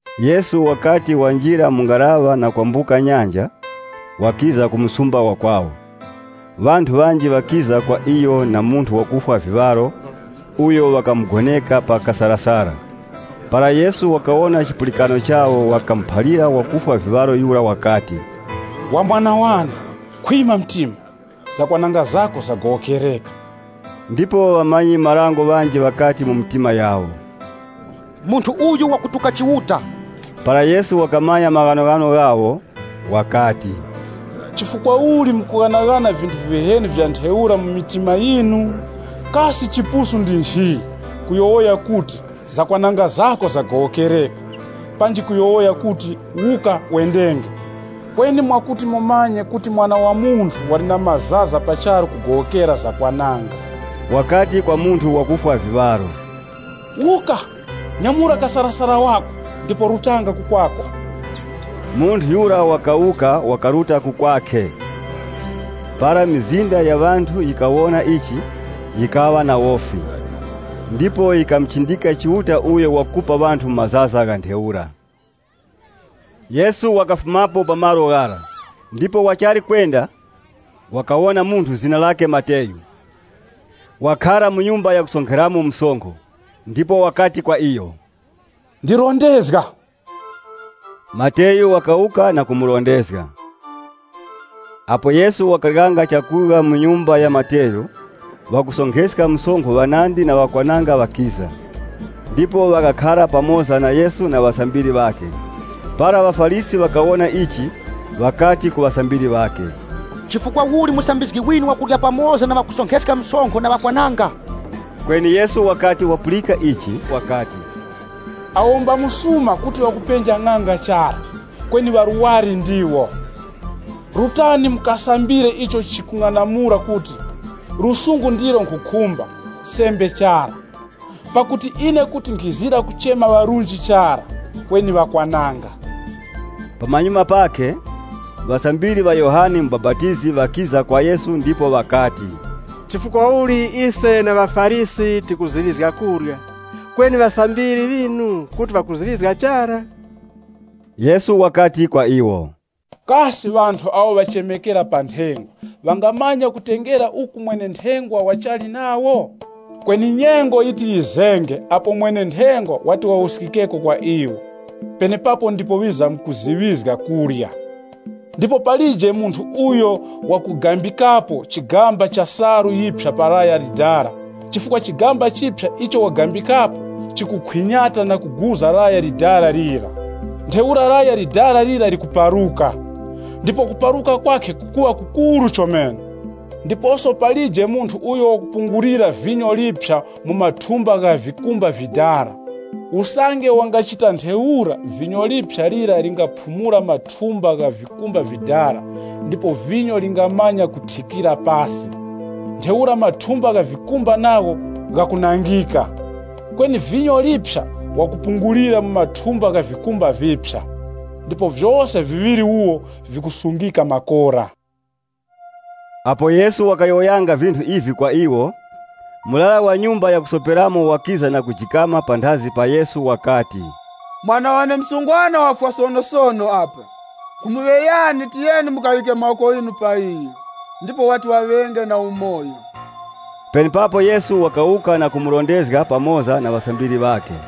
Yesu wakati wanjira mu ngaraŵa na kwambuka nyanja, wakiza ku msumba wa kwawo. Ŵanthu ŵanji ŵakiza kwa iyo na munthu wakufwa viŵaro, uyo ŵakamugoneka pa kasarasara. Para Yesu wakawona chipulikano chawo wakamuphalira wakufwa viŵaro yura wakati, “Wa mwana wane, khwima mtima. Zakwananga zako zagowokereka.” Ndipo ŵamanyi-marango ŵanji ŵakati mu mitima yawo, “Munthu uyu wakutuka Chiuta.” Para Yesu wakamanya maghanoghano ghawo, wakati, “Chifukwa uli mukughanaghana vinthu viheni vya ntheura mu mitima yinu? Kasi chipusu ndi nchi, kuyowoya kuti, ‘Zakwananga zako zagowokereka,’ panji kuyowoya kuti, ‘Wuka, wendenge?’ Kweni mwakuti mumanye kuti Mwana wa Munthu wali na mazaza pa charu kugowokera zakwananga, wakati kwa munthu wakufwa viŵaro, ‘Wuka, nyamura kasarasara wako ndipo rutanga ku kwako.’” Munthu yura wakawuka, wakaruta ku kwakhe. Para mizinda ya ŵanthu yikawona ichi, yikaŵa na wofi. Ndipo yikamuchindika Chiuta uyo wakupa ŵanthu mazaza gha ntheura. Yesu wakafumapo pa malo ghara, ndipo wachali kwenda, wakawona munthu zina lakhe Mateyu, wakhara mu nyumba yakusonkheramo msonkho, ndipo wakati kwa iyo, “Ndirondezga.” Mateyu wakawuka na kumurondezga. Apo Yesu wakaryanga chakurya mu nyumba ya Mateyu, ŵakusonkheska msonkho ŵanandi na ŵakwananga ŵakiza, ndipo ŵakakhara pamoza na Yesu na ŵasambiri ŵakhe. Para ŵaFarisi ŵakawona ichi, ŵakati ku ŵasambiri ŵakhe, “Chifukwa uli musambizgi winu wakurya pamoza na ŵakusonkheska msonkho na ŵakwananga?” Kweni Yesu wakati wapulika ichi wakati, “Awo mba msuma kuti ŵakupenja ng'anga chara, kweni ŵarwari ndiwo. Rutani mukasambire icho ichi chikung'anamula kuti ‘Chisungusungu ndicho nkhukhumba, sembe chara.’ Pakuti ine kuti nkhizira kuchema ŵarunji chara, kweni ŵakwananga.” Pamanyuma pakhe, ŵasambiri ŵa Yohane Mubapatizi ŵakiza kwa Yesu ndipo ŵakati, “Chifukwa uli ise na ŵaFarisi tikuziŵizga kurya, kweni ŵasambiri ŵinu kuti ŵakuziŵizga chara?” Yesu wakati kwa iwo, Kasi ŵanthu awo ŵachemekera pa nthengwa ŵangamanya kutengera uku mwene-nthengwa wachali nawo? Kweni nyengo yitizenge apo mwene-nthengwa wati wawuskikeko kwa iwo. Penepapo ndipo ŵizamkuziŵizga kurya. “Ndipo palije munthu uyo wakugambikapo chigamba cha salu yiphya pa laya likoroŵere, chifukwa chigamba chiphya icho wagambikapo chikukhwinyata na kuguza laya likoroŵere lira. Ntheura laya likoroŵere lira likuparuka, ndipo kuparuka kwakhe kukuŵa kukuru chomene. Ndiposo palije munthu uyo wakupungulira vinyo liphya mu mathumba gha vikumba vidala. Usange wangachita ntheura vinyo liphya lira lingaphumula mathumba gha vikumba vidala ndipo vinyo lingamanya kuthikira pasi. Ntheura mathumba gha vikumba nagho ghakunangika. Kweni vinyo liphya wakupungulira mu mathumba gha vikumba viphya. Ndipo vyose viŵiri wuwo vikusungika makora.” Apo Yesu wakayowoyanga vinthu ivi kwa iwo, murara wa nyumba yakusoperamo wakiza na kujikama panthazi pa Yesu wakati, “Mwana wane msungwana wafwa sonosono apa. Nkhumuŵeyani, tiyeni mukaŵike mawoko ghinu pa iyo, ndipo wati waŵenge na umoyo.” Penepapo Yesu wakawuka na kumurondezga, pamoza na ŵasambiri ŵakhe.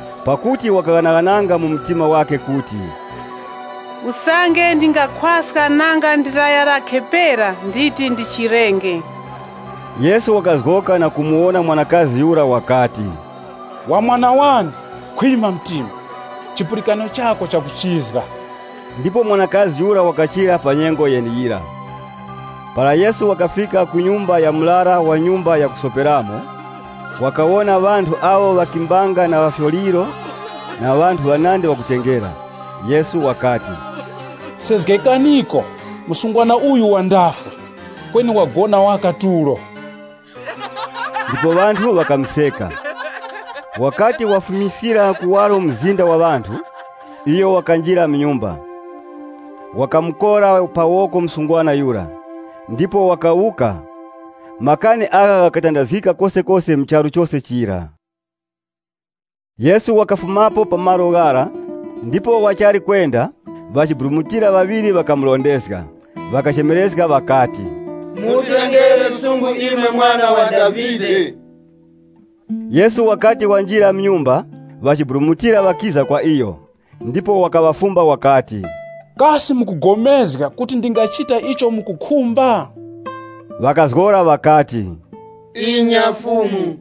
Pakuti wakaghanaghananga mu mtima wakhe kuti, “Usange ndingakhwaska nanga ndi laya lakhe pera, nditi ndichirenge.” Yesu wakazgoka na kumuwona mwanakazi yura wakati, “Wa mwana wane, khwima mtima! Chipulikano chako chakuchizga.” Ndipo mwanakazi yura wakachira pa nyengo yeneyira. Para Yesu wakafika ku nyumba ya murara wa nyumba yakusoperamo, wakawona ŵanthu awo ŵakimbanga na ŵafyoliro na ŵanthu ŵanandi ŵakutengera. Yesu wakati, “Sezgekaniko! Msungwana uyu wandafwe, kweni wagona waka tulo.” Ndipo ŵanthu ŵakamuseka. Wakati wawufumiskira kuwaro mzinda wa ŵanthu, iyo wakanjira mu nyumba, wakamukora pa woko msungwana yura, ndipo wakawuka. Makani agha ghakatandazgika kosekose mu charu chose chira. Yesu wakafumapo pa malo ghara, ndipo wachali kwenda, ŵachiburumutira ŵaŵiri ŵakamurondezga. Ŵakachemerezga ŵakati, “Mutilengere lusungu, imwe Mwana wa Davide!” Yesu wakati wanjira mu nyumba, ŵachiburumutira ŵakiza kwa iyo, ndipo wakaŵafumba wakati, “Kasi mukupulikana kuti ndingachita icho mukukhumba?” Ŵakazgora ŵakati, “Inya, Fumu!”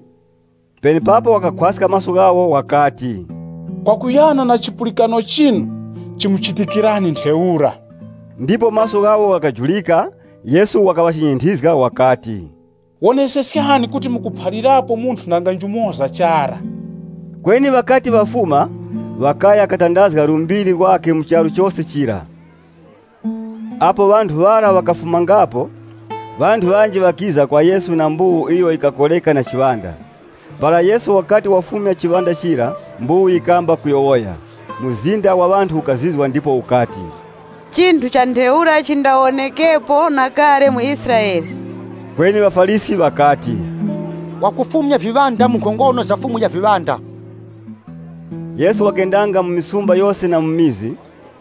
Penepapo wakakhwaska maso ghawo wakati, “Kwakuyana na chipulikano chinu chimuchitikirani ntheura.” Ndipo maso ghawo ghakajurika. Yesu wakaŵachinyinthizga wakati, “Woneseskani kuti mukuphalirapo munthu nanga njumoza chara.” Kweni ŵakati ŵafuma, ŵakaya katandazga lumbiri lwakhe mu charu chose chira. Apo ŵanthu ŵara ŵakafumangapo, ŵanthu ŵanji ŵakiza kwa Yesu na mbuwu iyo yikakoreka na chiŵanda. Para Yesu wakati wafumya chiŵanda chira, mbuwu yikamba kuyowoya. Mzinda wa ŵanthu ukazizwa ndipo ukati, “Chinthu cha ntheura chindawonekepo na kale mu Israele.” Kweni ŵaFarisi ŵakati, “Wakufumya viŵanda mu nkhongono za mukuru wa viŵanda.” Yesu wakendanga mu misumba yose na mu vikaya.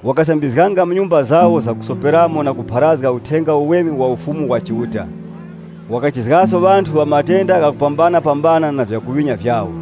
Wakasambizganga mu nyumba zawo zakusoperamo na kupharazga Uthenga Uweme wa Ufumu wa Chiuta Wakachizgangaso ŵanthu ŵa matenda ghakupambanapambana na vyakuŵinya vyawo.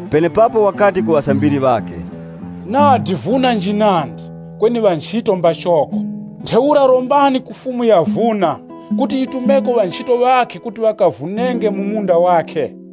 Penepapo wakati ku ŵasambiri ŵakhe, “Nadi vuna njinandi, kweni ŵanchito mbachoko. Ntheura rombani ku Fumu ya vuna, kuti yitumeko ŵanchito ŵakhe kuti ŵakavunenge mu munda wakhe.”